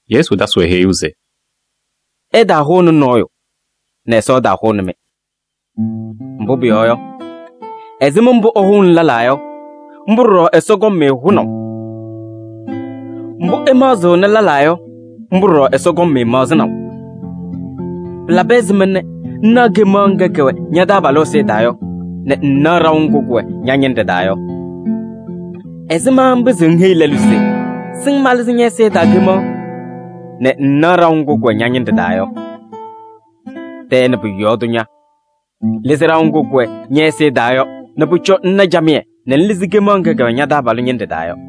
Yesu tasɩ-wɛ heyuu se: “Ɩtaahʋnɩ nɔɔyʋ nɛ Ɛsɔ ɛtaahʋnɩ-mɩ. Mbʋ pʋyɔɔ yɔ, ɛzɩma mbʋ ɩhʋʋnɩ lɛlaa yɔ, mbʋ ɖɔɖɔ Ɛsɔ kɔŋ-mɩ hʋnaʋ. Mbʋ ɩmaɣzɩɣnɩ lɛlaa yɔ, mbʋ ɖɔɖɔ Ɛsɔ kɔŋ-mɩ maɣzɩnaʋ. Pɩlabɩ ɛzɩma nɛ ŋnaɣ kemaɣ ŋga kɛwɛ ña-taabalʋ ɛzɩyɛ taa yɔ nɛ ŋŋnaɣ ɖaʋ ŋgʋ kʋwɛ ña-ñɩnɖɛ taa yɔ? Ɛzɩma ŋpɩzɩɣ ŋheyi lɛlʋ se: ‘Sɩŋ malɩzɩ ñɛ-ɛzɩyɛ taa kemaɣ’ nɛ ŋŋnaɣ ɖaʋ ŋgʋ kʋwɛ ña-ñɩnɖɛ taa yɔ? Tɛɛ nɛ pʋ-yɔɔ tʋ ña! Lɩzɩ ɖaʋ ŋgʋ kʋwɛ ñɛ-ɛzɩyɛ taa yɔ nɛ pʋcɔ ŋna camɩyɛ nɛ ŋlɩzɩ kemaɣ ŋga kɛwɛ ña-taabalʋ ñɩnɖɛ taa yɔ.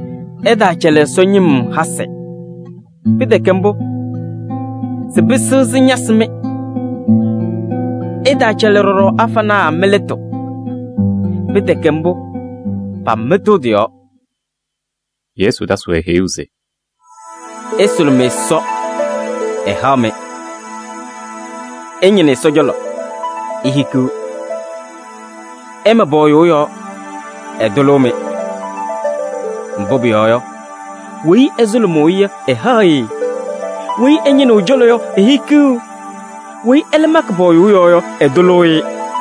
“Ɩtaacɛlɩ Ɛsɔ ñɩm hasɩ. Pɩtɛkɛ mbʋ, sɩpɩsɩɣ sɩñasɩ-mɩ. Ɩtaacɛlɩ ɖɔɖɔ afanaa mɩ-lɩtʋ. Pɩtɛkɛ mbʋ, pamɩtɩɣ tɩ-yɔɔ.” Yesu tasɩ-wɛ heyuu se: “Ɩsʋlʋmɩ Ɛsɔ, ɛhaɣ-mɩ, ɩñɩnɩ ɛ-cɔlɔ, ihikiɣ, ɩma pɔɔyʋʋ yɔɔ, ɛtʋlʋʋ-mɩ. Mbʋ pʋyɔɔ yɔ, weyi ɛsʋlʋmʋʋ-ɩ yɔ, ɛhaɣ-ɩ, weyi ɛñɩnɩɣ ɛ-cɔlɔ yɔ, ehikiɣ, weyi ɛlɛ makɩ pɔɔyʋʋ yɔɔ yɔ, ɛtʋlʋʋ-ɩ.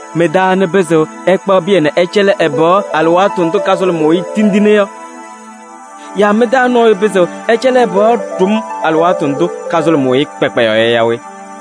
Mɩ-taa anɩ pɩzɩɣ ɛkpaɣ pɩyɛ nɛ ɛcɛlɩ ɛ-pɩɣa alɩwaatʋ ndʋ kasʋlʋmʋʋ-ɩ tindine yɔ? Yaa mɩ-taa nɔɔyʋ pɩzɩɣ ɛcɛlɩ ɛ-pɩɣa ɖʋm alɩwaatʋ ndʋ kasʋlʋmʋʋ-ɩ kpakpayaɣ yɔ yaa we?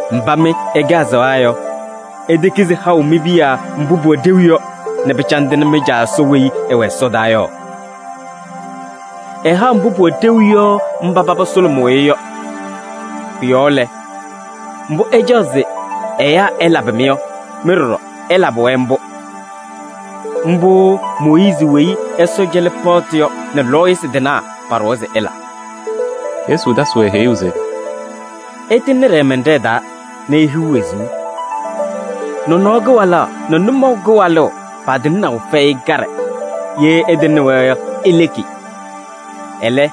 Mba mɩ ɩkɛ azaɣa yɔ, itekizi haʋ mi-piya mbʋ pʋwɛ ɖeu yɔ nɛ pɩcandɩnɩ mɩ-Caa Ɛsɔ weyi ɛwɛ ɛsɔdaa yɔ? Ɛhaɣ mbʋ pʋwɛ ɖeu yɔ mba paba sʋlʋmʋʋ-ɩ yɔ. Pʋ-yɔɔ lɛ, mbʋ ɩcaɣ se ɛyaa ɛlabɩ-mɩ yɔ, mɩ ɖɔɖɔ ɩlabɩ-wɛ mbʋ. Mbʋ Mooyiizi weyi Ɛsɔ cɛlɩ paɣtʋ yɔ nɛ lɔɔyɩsɩ tɩnaa paɖʋwa se ɩla.” Yesu tasɩ-wɛ heyuu se: “Ɩtɩŋnɩ ɖɛɛmɛnɖɛɛ taa nɛ ihiɣ wezuu. Nɔnɔɔ kɩwalaɣ nɛ nʋmɔʋ kɩwalʋʋ patɩŋnaʋ fɛyɩ kaɖɛ, ye ɩtɩŋnɩ-wɛ yɔ, ileki. Ɛlɛ,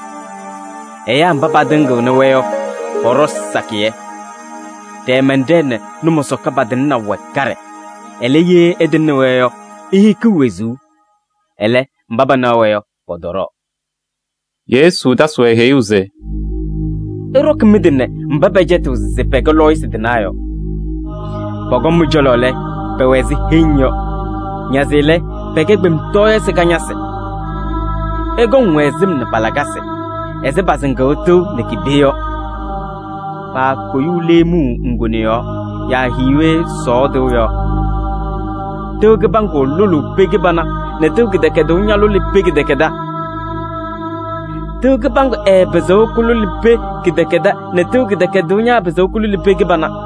ɛyaa mba patɩŋɩɣnɩ-wɛ yɔ pɔɖɔ sakɩyɛ. Ɖɛɛmɛnɖɛɛ nɛ nʋmɔsɔka patɩŋnaʋ wɛ kaɖɛ, ɛlɛ, ye ɩtɩŋnɩ-wɛ yɔ, ihikiɣ wezuu. Ɛlɛ, mba panaɣ-wɛ yɔ, pɔtɔɖɔɔ.” Yesu tasɩ-wɛ heyuu se: “Ɩɖɔkɩ mɩ-tɩ nɛ mba pɛcɛtɩɣ se pɛkɛ lɔɔyɩsɩ tɩnaa yɔ. Pɔkɔŋ mɩ-cɔlɔ lɛ, pɛwɛ ɛzɩ heŋ, nazɩ lɛ, pɛkɛ kpemtɔɔyɩsɩ kañadɩnaa. Ɩkɔŋ-wɛ sɩm nɛ pa-lakasɩ ɛzɩ pasɩŋʋʋ tɩʋ nɛ ki-pee yɔ. Paakoyuu leemuu ŋgone yɔɔ yaa hiiwe sɔɔ tɩʋ yɔɔ. Tɩʋ kɩbaŋgʋ lʋlʋʋ pee kɩbana nɛ tɩʋ kɩdɛkɛdʋʋ ñalʋlɩ pee kɩdɛkɛdɛɛ. Tɩʋ kɩbaŋgʋ ɛɛpɩzɩɣ kʋlʋlɩ pee kɩdɛkɛdɛɛ nɛ tɩʋ kɩdɛkɛdʋʋ ñaapɩzɩɣ kʋlʋlɩ pee kɩbana.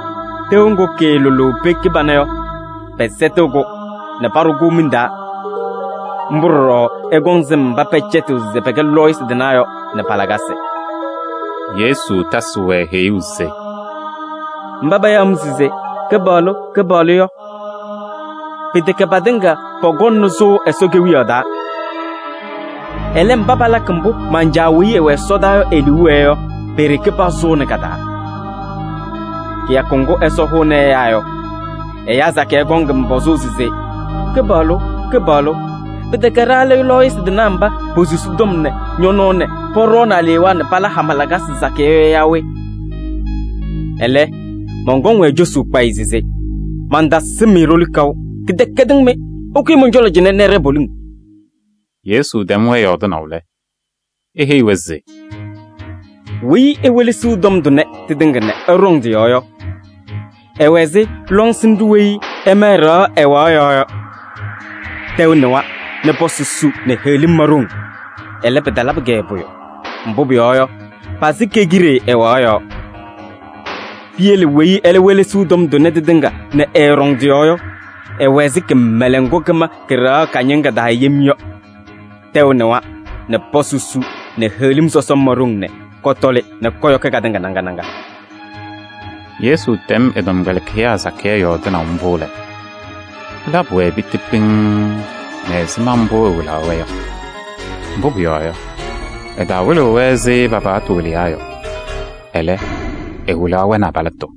Tɩʋ ŋgʋ kɩɩlʋlʋʋ pee kɩbana yɔ, pɛsɛtɩɣ-kʋ nɛ paɖʋ-kʋ miŋ taa. Mbʋ ɖɔɖɔ ɩkɔŋ sɩm mba pɛcɛtɩɣ se pɛkɛ lɔɔyɩsɩ tɩnaa yɔ nɛ pa-lakasɩ.” Yesu tasɩ-wɛ heyuu se: “Mba payaɣ-m se: ‘Kɩpaɣlʋ! Kɩpaɣlʋ!’ yɔ pɩtɛkɛ patɩŋa pɔkɔŋnɩ sʋʋ Ɛsɔ Kewiyaɣ taa. Ɛlɛ, mba palakɩ mbʋ man-Caa weyi ɛwɛ ɛsɔdaa yɔ e-liu wɛɛ yɔ, pe-ɖeke pasʋʋnɩ ka-taa. Kɩyakʋ ŋgʋ Ɛsɔ hʋʋnɩ ɛyaa yɔ, ɛyaa sakɩyɛ kɔŋ-m pɔzʋʋ se: ‘Kɩpaɣlʋ! Kɩpaɣlʋ! Pɩtɛkɛ ɖa lɛ lɔɔyɩsɩ tɩnaa mba posusi tɔm nɛ ñɔ-nɔɔ nɛ pɔɖɔɔnɩ alewaa nɛ pala hama lakasɩ sakɩyɛ yɔ yaa we?’ Ɛlɛ, mɔnkɔŋ-wɛ cosuu kpayɩ se: ‘Mantasɩm-mɩ ɖoli kaʋ. Kɩdɛkɛdɩŋ mɩ! Ɩkʋyɩ mɔn-cɔlɔ cɩnɛ nɛ ɩɖɛɛ poliŋ.’” Yesu tɛm-wɛ yɔɔdɩnaʋ lɛ, eheyi-wɛ se: “Weyi ewelesiɣ tɔm tʋnɛ tɩtɩŋa nɛ ɛɖɔŋ tɩ-yɔɔ yɔ, ɛwɛ ɛzɩ lɔŋsɩnɖʋ weyi ɛma ɛ-ɖɩɣa ɛwaɣ yɔɔ yɔ. Tɛʋ nɩwa nɛ pɔsɩ su nɛ heɣlim ma ɖoŋ. Ɛlɛ, pɩtalabɩ-kɛ pʋyʋ, mbʋ pʋyɔɔ yɔ, pasɩ ke-kide ɛwaɣ yɔɔ. Piyele weyi ɛlɛ welesiɣ tɔm tʋnɛ tɩtɩŋa nɛ ɛɛɖɔŋ tɩ-yɔɔ yɔ, ɛwɛ ɛzɩ kɩmɛlɛŋ ŋgʋ kɩma kɩ-ɖɩɣa kañɩŋa taa yem yɔ. Tɛʋ nɩwa nɛ pɔsɩ su nɛ heɣlim sɔsɔm ma ɖoŋ nɛ kɔtɔlɩ nɛ kɔyɔkɩ katɩŋa naŋa naŋa.” Yesu tɛm ɛ-tɔmkpɛlɩkɩyaa sakɩyɛ yɔɔdɩnaʋ mbʋ lɛ, pɩlabɩ-wɛ piti pɩŋŋ nɛ ɛzɩma mbʋ ɛwɩlaɣ-wɛ yɔ. Mbʋ pʋyɔɔ yɔ, ɛtawɩlɩɣ-wɛ ɛzɩ pa-paɣtʋ wɩlɩyaa yɔ. Ɛlɛ, ɛwɩlaɣ-wɛ nɛ abalɩtʋ.